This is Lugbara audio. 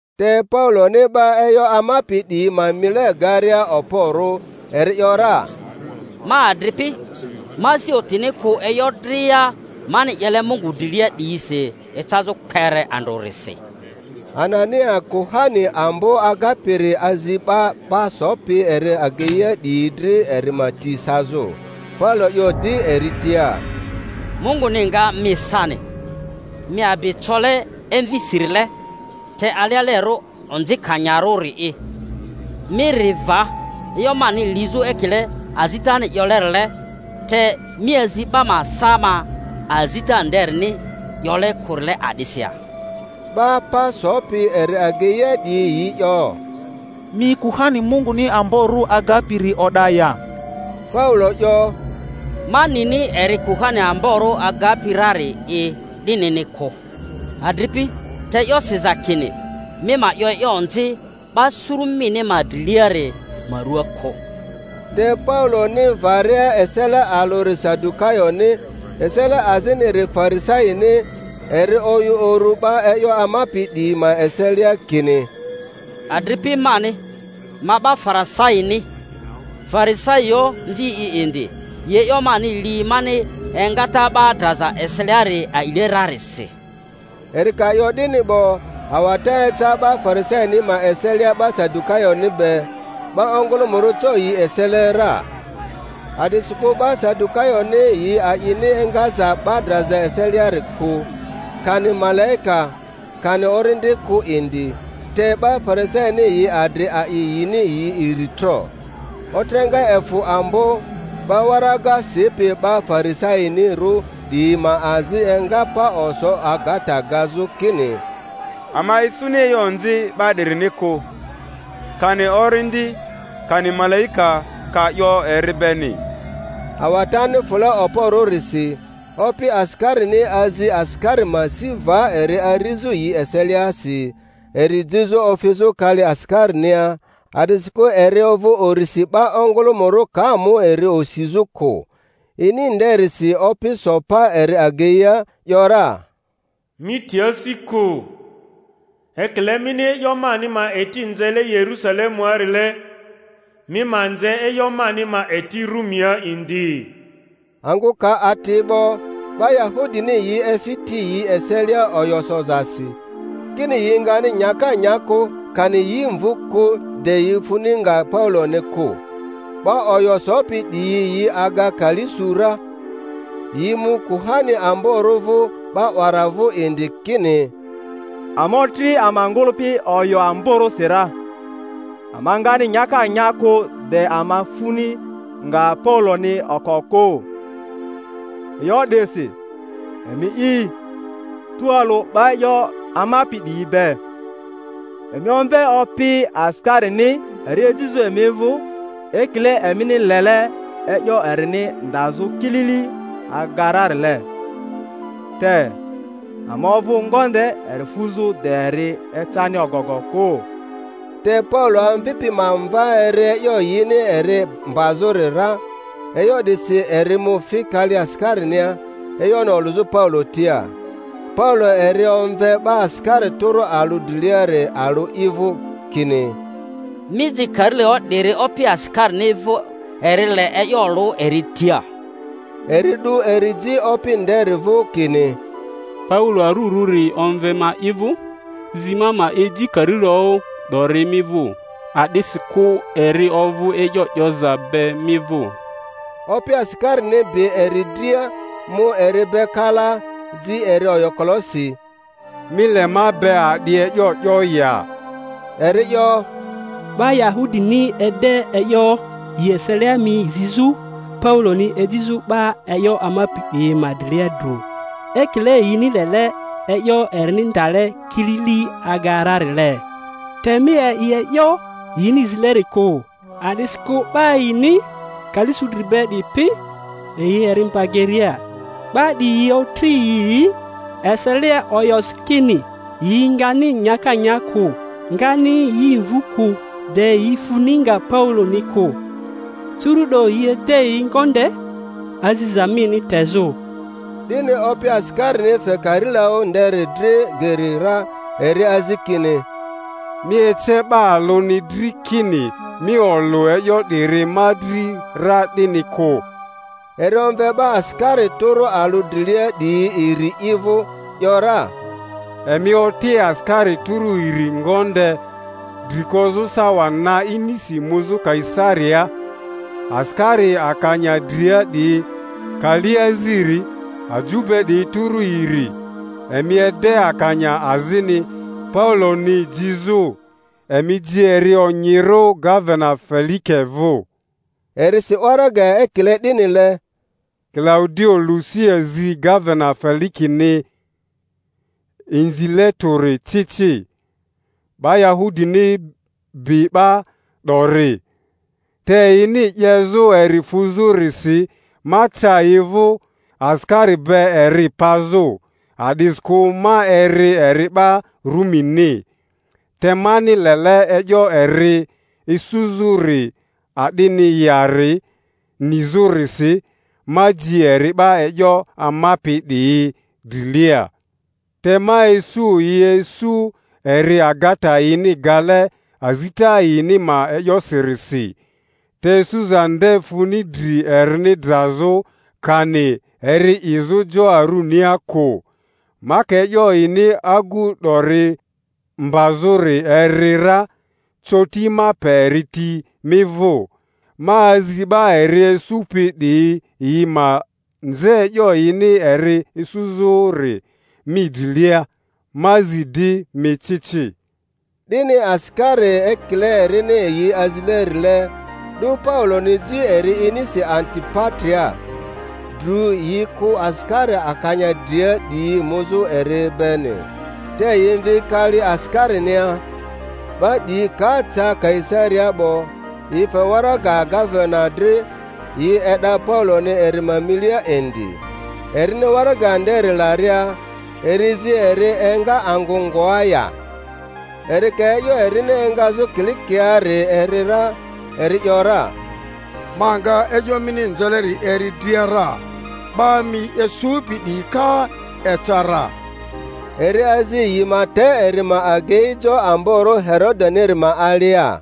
Te Pauloni 'ba e'yo amapi 'diyi ma mile garia okporᴜ, eri ‘yora, Ma adripi, ma asi otini kᴜ e'yo dria mani 'yele Mungu drilia 'diyisi ecazᴜ kpere andrᴜrisi. Anania kuhani ambo agapiri azi 'ba pa sopi eri ageia 'diyi dri eri ma ti sazᴜ. Paulo 'yo di eri tia, Munguni nga mi sani, mi abi cole evisirile te alealerᴜ onzikanyarᴜri'i! Mi ri va e'yo mani lizᴜ ekile azitani 'yolerile, te mi azi 'ba ma sa ma azita nderini 'yole kᴜrile a'disi ya? 'Ba pa sopi eri ageia 'diyi yi 'yo, Mi kuhani Munguni amborᴜ agapi-ri o'da ya? Paulo 'yo, Ma nini eri kuhani amborᴜ agapi rari'i 'dinini kᴜ, adripi; te e'yo siza kini, Mi ma 'yo e'yo onzi 'ba suru mini ma driliari ma ruaa kᴜ. Te Pauloni varia esele alᴜri Sadukayoni, esele aziniri Farisaini, eri oyᴜ uru 'ba e'yo amapi 'diyi ma eselia kini, Adripi mani, ma 'ba Farisaini, Farisaioᴜ mvi'i indi; yi e'yo mani li mani engata 'ba draza eseliari a'ile rarisi. Eri ka 'yo 'dini 'bo, awata eca 'ba Farisaini ma eselia 'ba Sadukayoni be; 'ba ongᴜlᴜmᴜrᴜ co yi esele ra. A’disikᴜ 'ba Sadukayoni yi a'ini engaza 'ba draza eseliari kᴜ, kani malaika, kani orindi kᴜ indi; te 'ba Farisaini yi adri a'i yini yi iri tro. Otreŋa efᴜ ambo; 'ba waraga sipi 'ba Farisainirᴜ 'diyi ma azi enga pa oso agata gazᴜ kini, Ama isuni e'yo onzi 'ba 'dirini kᴜ. Kani orindi kani malaika ka 'yo eri beni? Awatani fᴜle okporᴜrisi, opi asikarini azi asikari ma si va eri arizᴜ yi eseliasi, eri jizᴜ ofizᴜ kali asikari-nia, a'disikᴜ eri ovᴜ urisi 'ba ongᴜlᴜmᴜrᴜ ka mu eri osizᴜ kᴜ. Ini nderisi Opi so pa eri ageia, ‘yora, Mi ti asi kᴜ; ekile mini e'yo mani ma eti nzele Yerusale-muarile, mi ma nze e'yo mani ma eti Rumia indi. Angᴜ ka ati 'bo, 'ba Yahudini yi efi ti yi eselia oyo sozasi, kini yi ngani nyaka nya kᴜ, kani yi mvu kᴜ, de yi funi nga Pauloni kᴜ. 'Ba oyo sopi 'diyi yi aga kali su ra. Yi mu kuhani amborᴜ vᴜ 'ba 'wara vᴜ indi, kini, Ama otri ama ngᴜlᴜpi oyo amborᴜsi ra, ama ngani nyaka nya kᴜ de ama funi nga Pauloni oko kᴜ. E'yo 'disi emi'i, tualᴜ 'ba e'yo amapi 'diyi be, emi omve opi asikarini eri ejizᴜ emi vᴜ ekile emini lele e'yo erini ndazᴜ kilili aga rarile. Te ama ovᴜ ngonde eri fuzᴜ de eri ecani ogogo kᴜ. Te Paulo amvipi ma mva eri e'yo yini eri mbazᴜri ra; e'yo 'disi eri mu fi kali asikarinia, e'yoni olᴜzᴜ Paulo tia. Paulo eri omve 'ba asikari tᴜrᴜ alᴜ driliari alᴜ i vᴜ, kini, Mi ji karilaᴜ 'diri opi asikarini vᴜ, eri le e'yo olᴜ eri tia. Eri 'du eri ji opi nderi vᴜ, kini, Paulo arurᴜri omve ma i vᴜ, zi ma ma eji karilaᴜ 'dori mi vᴜ, a'disikᴜ eri ovᴜ e'yo 'yoza be mi vᴜ. Opi asikarini bi eri dria, mu eri be kalaa, zi eri oyokolosi, Mi le ma be a'di e'yo 'yo ya? Eri 'yo, Ba Yahudini ede e'yo yi eselia mi zizᴜ Pauloni ejizᴜ 'ba e'yo amapi 'diyi ma drilia dru, ekile yini lele e'yo erini ndale kilili aga rarile. Te mi a'i e'yo yini zileri kᴜ; a'disikᴜ 'ba yini kali su dri be 'dipi yi eri mba geria. 'Ba 'diyi otri yi yi eselia oyosi kini, yi ngani nyaka nya kᴜ, ngani yi mvu kᴜ, de yi funi nga Pauloni kᴜ; curu'do yi ede yi ngonde, aziza mini tezᴜ. 'Dini opi asikarini fe karilaᴜ nderi dri geri ra, eri azi kini, Mi ece 'ba alᴜni dri kini mi olᴜ e'yo 'diri ma dri ra 'dini kᴜ. Eri omve 'ba asikari tᴜrᴜ alᴜ drilia 'diyi iri i vᴜ, ‘yora, Emi oti asikari tᴜrᴜ iri ngonde, dri kozᴜ sawa na inisi muzᴜ Kaisariaa, asikari akanya dria 'diyi kali aziri, aju be 'diyi tᴜrᴜ iri. Emi ede akanya azini Pauloni jizᴜ, emi ji eri onyirᴜ gavena Felike vᴜ. Eri si waraga ekile 'dinile: Kilaudio Lusia zi gavena Felikeni Inzile Tᴜri ci ci. 'Ba Yahudini bi 'ba 'dori, te yini 'yezᴜ eri fuzᴜrisi ma ca yi vᴜ asikari be eri pazᴜ, a'disikᴜ ma eri eri 'ba Rumini. Te mani lele e'yo eri esᴜzᴜri a'dini yari nizᴜrisi, ma ji eri 'ba e'yo amapi 'diyi drilia. Te ma isu yi esᴜ eri agata yini gale azita yini ma e'yosirisi, te esᴜza nde funi dri erini drazᴜ kani eri 'izᴜ jo arunia kᴜ. Ma ka e'yo yini agu 'dori mbazᴜri eri ra, coti ma pe eri ti mi vᴜ, ma azi 'ba eri esᴜpi 'diyi yi ma nze e'yo yini eri esᴜzᴜri mi drilia. Ma zi di mi ci ci. 'Dini asikari, ekile erini yi azilerile, 'du Pauloni ji eri inisi Antipatria. Drᴜ yi kᴜ asikari akanya dria 'diyi muzᴜ eri beni, te yi mvi kali asikarinia. 'Ba 'diyi ka ca Kaisariaa 'bo, yi fe waraga gavena dri, yi e'da Pauloni eri ma milia indi. Erini waraga nderi laria, eri zi eri enga angᴜ ngoa ya. Eri ka e'yo erini engazᴜ Kilikiaari eri ra, eri ‘yora, Ma nga e'yo mini nzeleri eri dria ra, 'ba mi esᴜpi 'diyi ka eca ra. Eri azi yi ma te eri ma agei jo amborᴜ Herodeniri ma alia.